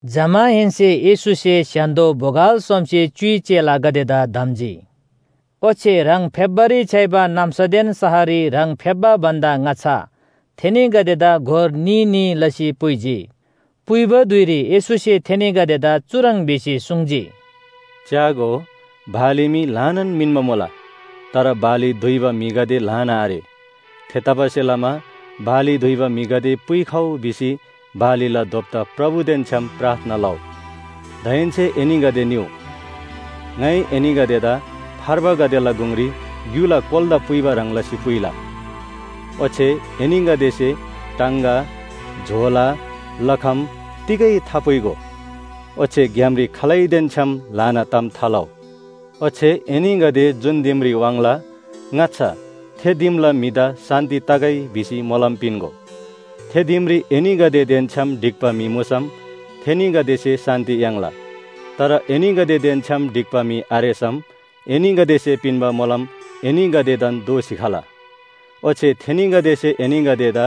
जमाहेन्‍से येशूसे स्‍य्‍हान्‍दो बोगल सोमसे च्‍युइ चेलागदेदा धम्‍जी। ओच्‍छे ह्राङ फेप्‍बारी छ्‌याइबा नाम्‍सादेन शहररी ह्राङ फेप्‍बा भन्‍दा ङाच्‍छा थेनीगदेदा गोर न्‍ही न्‍ही लसी पुइजी। पुइबा धुइरी येशूसे थेनीगदेदा चुह्रङ् भिसी सुङ्जी, “च्‍यागो, बाली मी ल्‍हानान मिन्‍बा मुला, तर बाली दुइबा म्‍हिगदे ल्‍हाना आरे। थेतबासेलमा बाली दुइबा म्‍हिगदे पुइखउ भिसी बालीला दोप्‍ता प्रभुदेन छ्‌याम प्रार्थना लउ। दाहेन्‍से एनीगदे निउ। ङाइ एनीगदेदा फार्बागदेला गुङरी ग्‍युला कोलादा पुइबा ह्रङ् लसी पुइला। ओच्‍छे एनीगदेसे टाङगा, झोला, लखम तिगै थापुइगो। ओच्‍छे ग्‍यामरी खालैदेन छ्‌याम ल्‍हाना ताम थालउ। “ओच्‍छे एनीगदे जुन दिमरी वाङ्ला ङाच्‍छा ‘थे दिमला म्‍हिदा शान्‍ति तगै’ भिसी मोलम पिन्‍गो। थे दिमरी एनीगदेदेन छ्‌याम ढिक्‍बा म्‍हि मुसम थेनीगदेसे शान्‍ति याङ्ला। तर एनीगदेदेन छ्‌याम ढिक्‍बा म्‍हि आरेसम एनीगदेसे पिन्‍बा मोलम एनीगदेदान दोःसी खला। ओच्‍छे थेनीगदेसे एनीगदेदा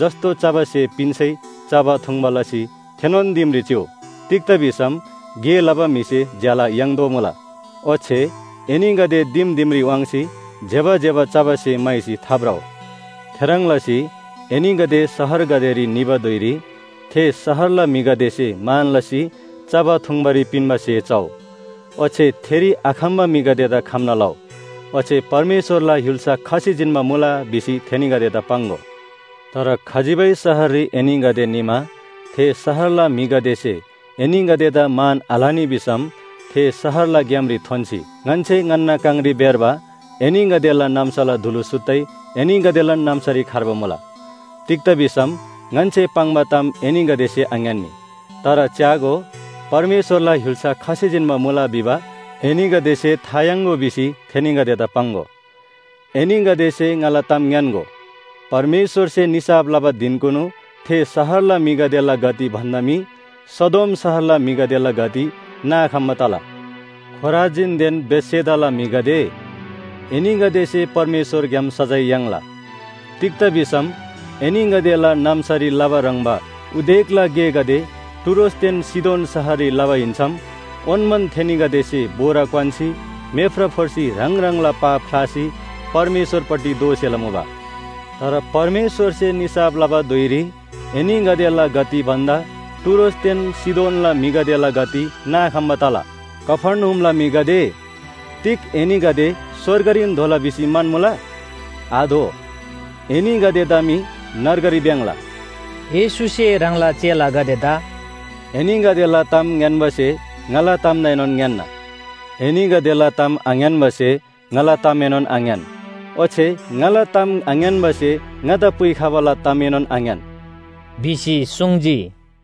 जस्‍तो चबा स्‍हे पिन्‍सै चबा थुङ्बा लसी थेनोन दिमरी चिउ। तिग्‍दा भिसम गे लबा म्‍हिसे ज्‍याला याङ्तोःमुला। ओच्‍छे एनीगदे दिम दिमरी वाङ्सी ज्‍यबा ज्‍यबा चबा स्‍हे म्‍हाइसी थाभ्रउ। “थेह्रङ् लसी एनीगदे शहरगदेरी निबा धुइरी थे शहरला म्‍हिगदेसे मान लसी चबा थुङ्बारी पिन्‍बा स्‍हे चउ। ओच्‍छे थेरी आखम्‍बा म्‍हिगदेदा खम्‍ना लउ, ‘ओच्‍छे परमेश्‍वरला य्‍हुल्‍सा खसी जिन्‍बा मुला’ भिसी थेनीगदेदा पाङ्‍गो। तर खजिबै शहररी एनीगदे निमा थे शहरला म्‍हिगदेसे एनीगदेदा मान आलनी भिसम थे शहरला ग्‍यामरी थोन्‍सी, ‘ङन्‍से ङन्‍ना काङरी भेर्बा एनीगदेला नाम्‍साला धुलु सुत्तै एनीगदेलान नाम्‍सारी खर्बा मुला। तिग्‍दा भिसम ङन्‍से पाङ्बा ताम एनीगदेसे आङ्‌यान्‍नी। तर च्‍यागो, परमेश्‍वरला य्‍हुल्‍सा खसी जिन्‍बा मुला भिबा एनीगदेसे था याङ्‍गो’ भिसी थेनीगदेदा पाङ्‍गो। एनीगदेसे ङाला ताम ङ्‌यान्‍गो, परमेश्‍वरसे निसाफ लबा धिनकुनु थे शहरला म्‍हिगदेला गति भन्‍दा मी सदोम शहरला म्‍हिगदेला गति नाखम्‍बा तला। “खोराजीनदेन बेथसेदाला म्‍हिगदे, एनीगदेसे परमेश्‍वरग्‍याम सजाय याङ्ला। तिग्‍दा भिसम एनीगदेला नाम्‍सारी लबा ह्रङ्‌बा उदेकला गेगदे टुरोसदेन सीदोन शहररी लबा हिन्‍सम ओन्‍मान थेनीगदेसे बोरा क्‍वान्‍सी मेफ्रा फोर्सी ह्राङ ह्राङला पाप ख्‍लासी परमेश्‍वरपट्टि दोःसेला मुबा तर परमेश्‍वरसे निसाफ लबा धुइरी एनीगदेला गति भन्‍दा टुरोसदेन सीदोनला म्‍हिगदेला गति नाखम्‍बा तला। कफर्नहुमला म्‍हिगदे, तिग एनीगदे स्‍वर्गरीन धोला भिसी म्‍हन्‍मुला? आधो! एनीगदेदा मी नर्गरी भ्‍याङ्‍ला।” येशूसे ह्राङला चेलागदेदा “एनीगदेला ताम ङ्‌यान्‍बासे ङाला तामदाएनोन ङ्‌यान्‍ना, एनीगदेला ताम आङ्‌यान्‍बासे ङाला तामएनोन आङ्‌यान। ओच्‍छे ङाला ताम आङ्‌यान्‍बासे ङादा पुइखबाला तामएनोन आङ्‌यान” भिसी सुङ्जी।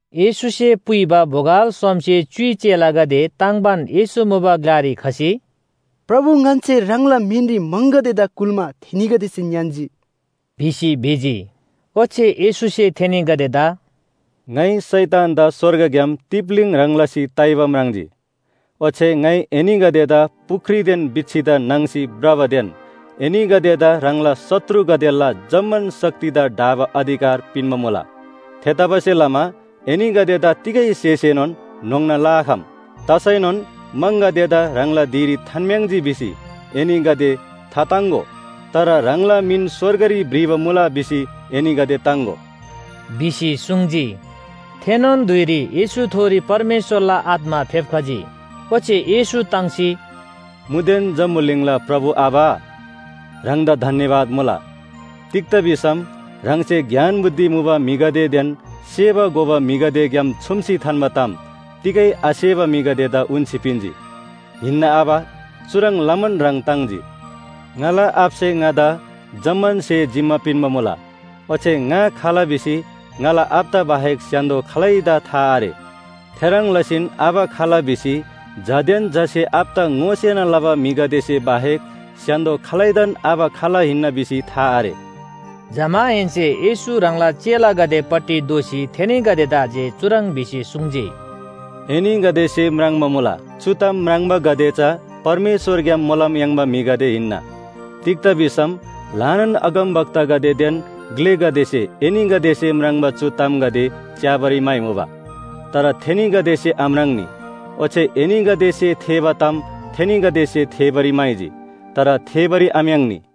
येशूसे पुइबा बोगल सोमसे च्‍युइ न्‍ही चेलागदे ताङ्बान येशू मुबा ग्‍लारी खसी, “प्रभु ङन्‍से ह्राङला मिनरी म्‍हङगदेदा कुल्‍मा थेनीगदेसे ङ्‌यान्‍जी” भिसी भिजी। ओच्‍छे येशूसे थेनीगदेदा “ङाइ शैतानदा स्‍वर्गग्‍याम तिप्‍लीङ ह्रङ् लसी ताइबा म्राङ्जी। ओच्‍छे ङाइ एनीगदेदा पुख्रीदेन बिच्‍छीदा नाङ्सी भ्रबादेन एनीगदेदा ह्राङला शत्रुगदेला जम्‍मान शक्तिदा ढाबा अधिकार पिन्‍बा मुला। थेतबासेलमा एनीगदेदा तिगै स्‍हेसेएनोन न्‍होङ्ना लआखम। तसैनोन म्‍हङगदेदा ह्राङला धिरी थान्‍म्‍याङ्जी भिसी एनीगदे थाताङ्‍गो। तर ह्राङला मिन स्‍वर्गरी भ्रिबा मुला भिसी एनीगदे ताङ्‍गो” भिसी सुङ्जी। थेनोन धुइरी येशूथोरी परमेश्‍वरला आत्‍मा फेप्‍खजी। ओच्‍छे येशू ताङ्सी, “मुदेन जम्‍बुलिङला प्रभु आबा, ह्राङदा धन्‍यवाद मुला, तिग्‍दा भिसम ह्राङसे ज्ञान बुद्धि मुबा म्‍हिगदेदेन सेबा घोबा म्‍हिगदेग्‍याम छुम्‍सी थान्‍बा ताम तिगै आसेबा म्‍हिगदेदा उन्‍सी पिन्‍जी। हिन्‍ना आबा, चुह्रङ् लमान ह्राङ ताङ्जी। “ङाला आबासे ङादा जम्‍मान स्‍हे जिम्‍मा पिन्‍बा मुला। ओच्‍छे ङा खाल भिसी ङाला आबादा बाहेक स्‍य्‍हान्‍दो खालैदा था आरे। थेह्रङ् लसीन आबा खाल भिसी झादेन झासे आबादा ङोसेना लबा म्‍हिगदेसे बाहेक स्‍य्‍हान्‍दो खालैदान आबा खाल हिन्‍ना भिसी था आरे।” जमाहेन्‍से येशू ह्राङला चेलागदेपट्टि दोःसी थेनीगदेदा जे चुह्रङ् भिसी सुङ्जी, “एनीगदेसे म्राङ्बा मुला, चु ताम म्राङ्बागदे चा परमेश्‍वरग्‍याम मोलम याङ्बा म्‍हिगदे हिन्‍ना। तिग्‍दा भिसम ल्‍हानान अगमवक्तागदेदेन ग्‍लेगदेसे एनीगदेसे म्राङ्बा चु तामगदे च्‍याबारी म्‍हाइमुबा। तर थेनीगदेसे आम्राङ्‌नी, ओच्‍छे एनीगदेसे थेःबा ताम थेनीगदेसे थेःबारी म्‍हाइजी, तर थेःबारी आम्‍याङ्नी।”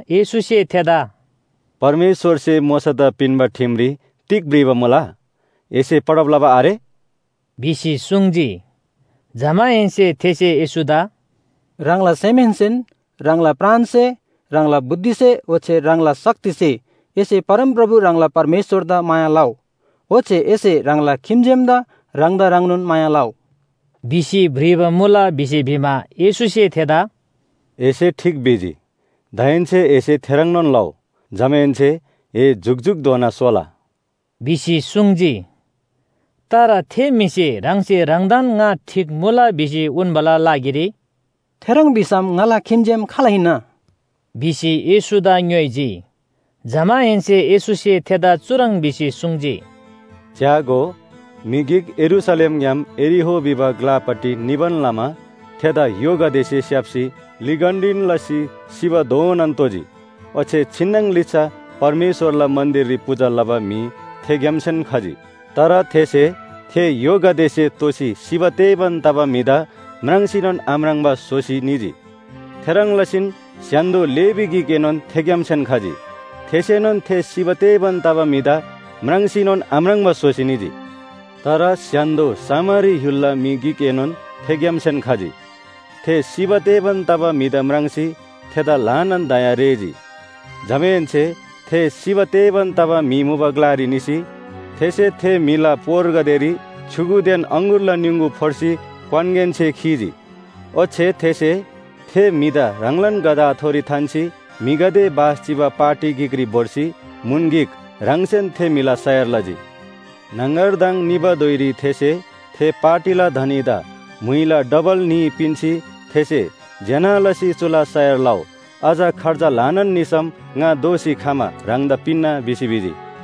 येशूसे थेदा “परमेश्‍वरसे मोशादा पिन्‍बा ठिमरी तिग भ्रिबा मुला? एसे पढब लबा आरे?” भिसी सुङ्जी। जमाहेन्‍से थेसे येशूदा “ह्राङला सेमहेन्‍सेन, ह्राङला प्राणसे, ह्राङला बुद्धिसे ओच्‍छे ह्राङला शक्तिसे एसे परमप्रभु ह्राङला परमेश्‍वरदा माया लउ। ओच्‍छे एसे ह्राङला खिम्‍जेमदा ह्राङदा ह्रङ्नोन माया लउ” भिसी भ्रिबा मुला। भिसी भिमा, येशूसे थेदा “एसे ठीक भिजी दाहेन्‍से एसे थेह्रङ्नोन लउ। जमाहेन्‍से ए जुकजुकधोना सोला” भिसी सुङ्जी। तर थे म्‍हिसे ह्राङसे ह्राङदान ङा ठीक मुला भिसी उन्‍बाला लागिरी “थेह्रङ् भिसम ङाला खिम्‍जेम खाल हिन्‍ना?” भिसी येशूदा ङ्‌योइजी। जमाहेन्‍से येशूसे थेदा चुह्रङ् भिसी सुङ्जी, “च्‍यागो, म्‍हि गिक यरूशलेमग्‍याम यरीहो भिबा ग्‍लापट्टि निबान लमा थेदा य्‍होगदेसे स्‍याप्‍सी लिगन्‍डीन लसी सिबाधोनान तोजी। ओच्‍छे छिन्‍नङ लिच्‍छा परमेश्‍वरला मन्‍दिररी पूजा लबा म्‍हि थेग्‍यामसेन खजी। तर थेसे थे य्‍होगदेसे तोसी सिबा तेबान तबा म्‍हिदा म्राङ्सीनोन आम्राङ्बा स्‍होसी निजी। थेह्रङ् लसीन स्‍य्‍हान्‍दो लेवी गिकएनोन थेग्‍यामसेन खजी थेसेनोन थे सिबा तेबान तबा म्‍हिदा म्राङ्सीनोन आम्राङ्बा स्‍होसी निजी। तर स्‍य्‍हान्‍दो सामरी य्‍हुलला म्‍हि गिकएनोन थेग्‍यामसेन खजी। थे सिबा तेबान तबा म्‍हिदा म्राङ्सी थेदा ल्‍हानान दया रेःजी। जमाहेन्‍से थे सिबा तेबान तबा म्‍हि मुबा ग्‍लारी निसी थेसे थे म्‍हिला पोरगदेरी छ्‌युगुदेन अङगुरला निङगु फोर्सी क्‍वानगेनसे खीजी। ओच्‍छे थेसे थे म्‍हिदा ह्राङलान गधाथोरी थान्‍सी म्‍हिगदे बास चिबा पाटी गिकरी भोर्सी म्‍हुन गिक ह्राङसेन थे म्‍हिला सयार लजी। न्‍हङगरदङ निबा धुइरी थेसे थे पाटीला धनीदा म्‍हुइला डबल न्‍ही पिन्‍सी थेसे ‘ज्‍यना लसी चुला सयार लउ, अझ खर्च ल्‍हानान निसम ङा दोःसी खमा ह्राङदा पिन्‍ना’ भिसी भिजी।”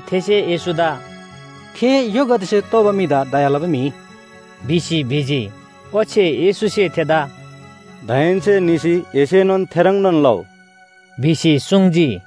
थेसे येशूदा “थे य्‍होगदेसे तोबा म्‍हिदा दया लबा म्‍हि” भिसी भिजी। ओच्‍छे येशूसे थेदा “दाहेन्‍से निसी एसेनोन थेह्रङ्नोन लउ” भिसी सुङ्जी।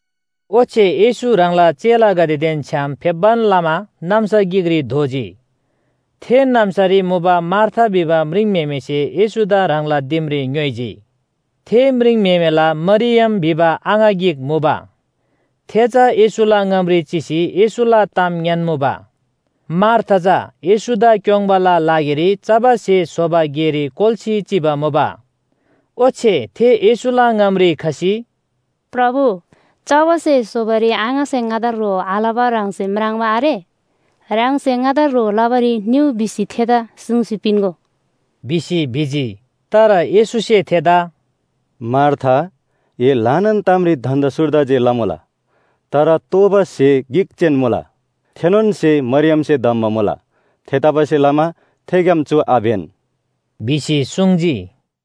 ओच्‍छे येशू ह्राङला चेलागदेदेन छ्‌याम फेप्‍बान लमा नाम्‍सा गिकरी धोजी, थे नाम्‍सारी मुबा मार्था भिबा म्रिङम्‍हेमेसे येशूदा ह्राङला दिमरी ङ्‌योइजी। थे म्रिङम्‍हेमेला मरियम भिबा आङा गिक मुबा, थे चा येशूला ङामरी चिसी येशूला ताम ङ्‌यान्‍मुबा। मार्था चा येशूदा क्‍योङ्बाला लागिरी चबा स्‍हे स्‍होबा गेरी कोल्‍सी चिबा मुबा। ओच्‍छे थे येशूला ङामरी खसी, “प्रभु, चबा स्‍हे स्‍होबारी आङासे ङादा ह्रो आलबा ह्राङसे म्राङ्बा आरे? ह्राङसे ङादा ह्रो लबारी निउ भिसी थेदा सुङ्सी पिन्‍गो” भिसी भिजी। तर येशूसे थेदा “मार्था, ए ल्‍हानान तामरी धन्‍दा सुर्दा जे लमुला। तर तोःबा स्‍हे गिक जेन मुला, थेनोन स्‍हे मरियमसे धम्‍बा मुला। थेतबासेलमा थेग्‍याम चु आब्‍यन” भिसी सुङ्जी।